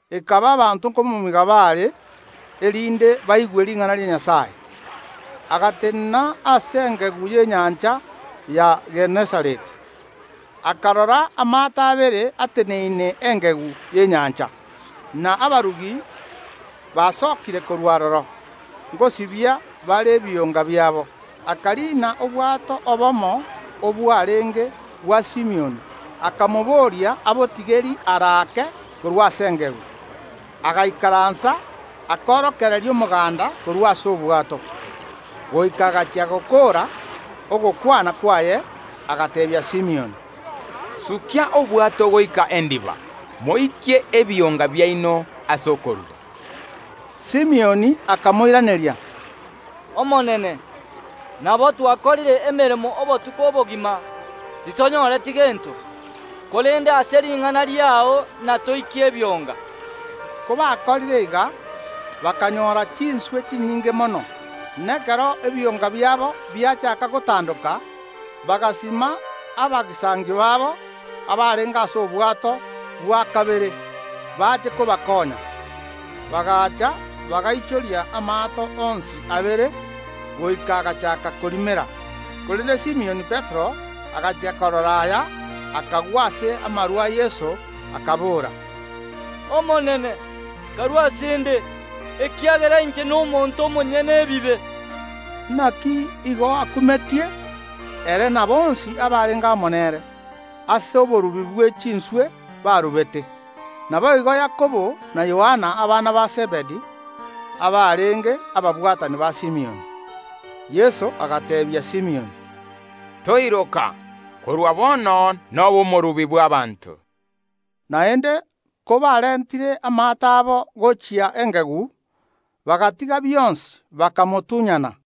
Ekaba abanto nkomomiga baare, erinde baigwe ring’ana ria Nyasae, agatenena ase engegu y’enyancha ya Genesareti, Akarora amaato abere ateneine engegu y’enyancha, na abarubi basokire korwa aroro, ngosibia bare ebionga biabo. Akariina obwato obomo obwarenge bwa Simioni akamobooria abotigerie are ake korwa ase engegu. Agaikaransa, akorokereria omoganda korwa ase obwato. Goika agachia gokoora ogokwana kwaye, agateebia Simioni, “Sukia obwato goika endiba, moikie ebionga biaino ase okoruba.” Simioni akamoiraneria, “Omonene, nabo twakorire emeremo obotuko obogima, titonyoreti gento, korende ase ring’ana riao natoikie ebionga.” Kobakorire iga, bakanyora chinswe chinyinge mono, na ekero ebionga biabo biachaaka gotandoka, bagasuma abagisangio babo, abarenge ase obwato bwa kabere, bache kobakonya. Bagacha, bagaichoria amaato onsi abere, goika agachaaka korimera. Korende Simioni Petero, agachia korora aya, akagwa ase amaru a Yeso, akabora, “Omonene, karue ase ’nde, ekiagera inche nomonto omonyene ebibe!” Naki igo akumetie, ere na bonsi abarenge amo nere, ase oborubi bwe chinswe barubete; naboigo Yakobo na Yohana, abana ba Zebedi, abarenge ababwatani ba Simioni. Yeso agateebia Simioni, “Toiroka; korwa bono nobe omorubi bw’abaanto.” Naende kobarentire amaato abo gochia engegu, bagatiga bionsi, bakamotunyana.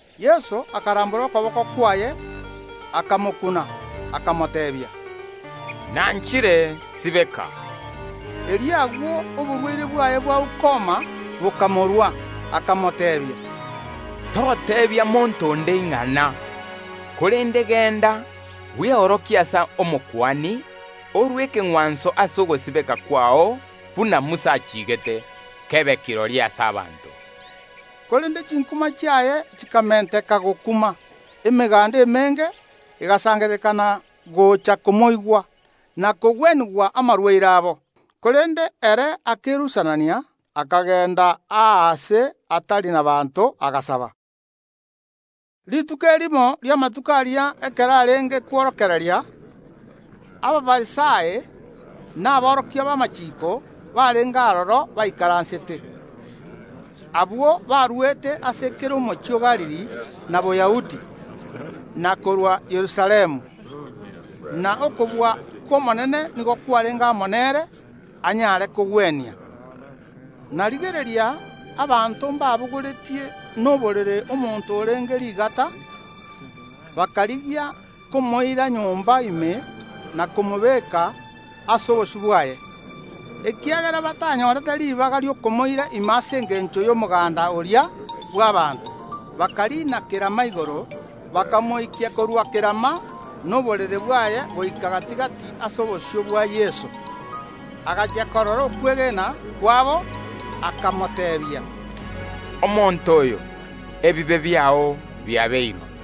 Yeso akarambora okoboko kwaye, akamokuna, akamoteebia, “Nanchire; sibeka.” Erio agwo oborwaire bwaye bwa ukoma bokamorua. Akamoteebia, “Toteebia monto onde ing’ana, korende genda, bweorokie ase Omokuani, orue ekeng’wanso ase ogosibeka kwao buna Musa achiigete, kebe kirori ase abanto.” Korende chinkuma chiaye chikamenteka gokuma. Emeganda emenge egasangererekana gocha komoigwa, na kogwenigwa amarwaire abo. Korende ere akerusanania, akagenda aase atari nabaanto, agasaba. Rituko erimo ri’amatuko aria ekero arenge kworokereria, Abafarisai na aborokia b’amachiiko barenge aroro baikaransete. Abwo baruete ase kera omochie o Galili na Boyahudi, na korwa Yerusalemu. Na okobua kw’Omonene nigo kwarenge amo nere anyare kogwenia. Na rigereria, abanto mbabogoretie noborere omonto orenge rigata, bakarigia komoira nyomba ime na komobeka ase obosio bwaye. Ekiagera batanyorete ribaga ri’okomoira ime ase engencho y’omoganda oria bw’abaanto, bakariina kerama igoro, bakamoikia korwa kerama noborere bwaye goika gati‐gati ase obosio bwa Yeso. Agachia korora okwegena kwabo, akamoteebia, “Mosani, ebibe biao biabeirwe.”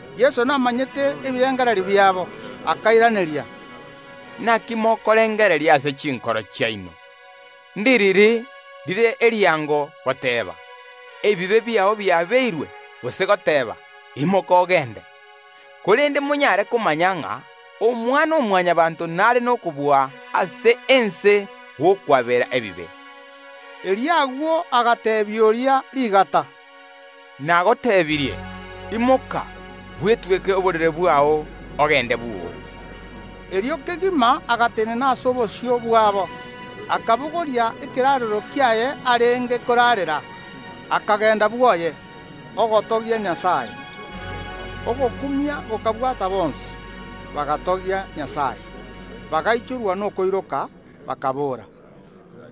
Yeso akamanya ebirengererio biabo, akairaneria, “Naki mokorengereria ase chinkoro chiaino? Ndiriri rire eriango, goteeba: Ebibe biao biabeirwe, gose goteeba: Imoka, ogende? Korende monyare komanya ng’a Omwana‐o‐Mwanyabaanto nare nokobua ase ense gw’okwabera ebibe.” Erio agwo agateebia oria rigata, “Nagoteebirie: Imoka, bwetweke oborere bwao, ogende bwoo.” Erio kegima agatenena ase obosio bwabo, akabogoria ekeraarero kiaye arenge koraarera, akagenda bwoye, ogotogia Nyasae. Ogokumia gokabwata bonsi, bagatogia Nyasae; bagaichorwa nokoiroka, bakaboora,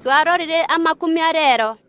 “Twarorire amakumia reero.”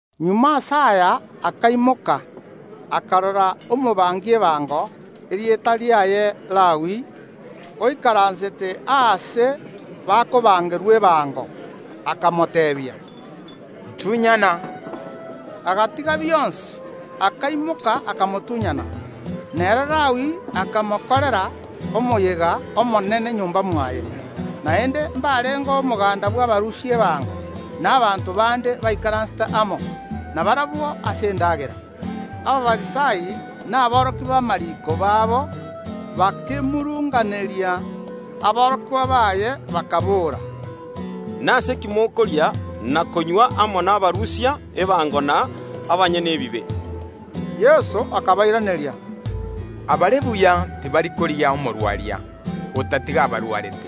Magega ase aya akaimoka, akarora omorusia ebango, erieta riaye Lawi, oikaransete aase bakoruseria ebango, akamoteebia, “Ntunyana!” Agatiga bionsi, akaimoka, akamotunyana. Nere Lawi akamokorera omoyega omonene nyomba mwaye, naende mbarengeo omoganda bw’abarusia ebango na abanto bande baikaransete amo nabarabwo ase endagera. Abafarisai na aborokia b’amariiko babo bakemurunganeria aborokigwa baye, bakaboora, “Nase ki mokoria na konywa amo nabarusia ebango na abanyene ebibe?” Yeso akabairaneria, “Abare buya tibari korigia omogwenia, otatiga abarwarete.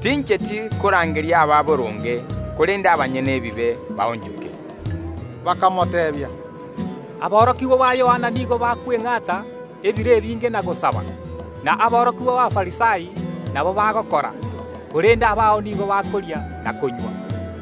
Tincheti korangeria ababoronge korende abanyene ebibe baonchoke.” Bakamoteebia, “Aborokigwa ba Yohana nigo bakweng’ata ebiro ebinge na gosaba, na aborokigwa b’Abafarisai nabo bagokora, korende abao nigo bakoria na konywa.”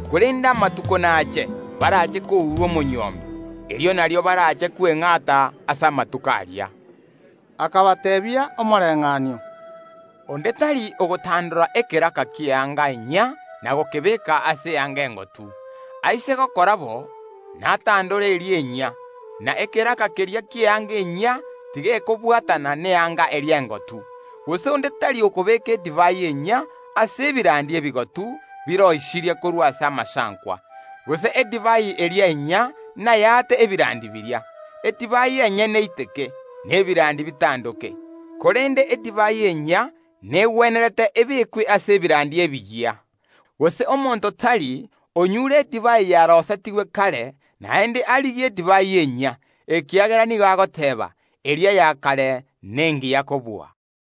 Korende amatuko nache, barache kourwa omonywomi, erio nario barache kweng’ata ase amatuko aria.” Akabateebia omoreng’anio: “Onde tari ogotandora ekeraka ki’eanga enyia na gokebeeka ase eanga engotu; aise gokora bo, natandore eria enyia, na ekeraka keria ki’eanga enyia tigekobwatana neanga eria engotu. Gose onde tari okobeeka edivai enyia ase ebirandi ebigotu biroisirie korwa ase amasankwa, gose edivai eria enyia nayaate ebirandi biria; edivai enyene eiteke, na ebirandi bitandoke. Korende edivai enyia negwenerete ebeekwe ase ebirandi ebiya. Gose omonto tari onyure edivai yaroisetigwe kare, naende arigie edivai enyia, ekiagera nigo agoteeba: Eria ya kare nengiya kobua.”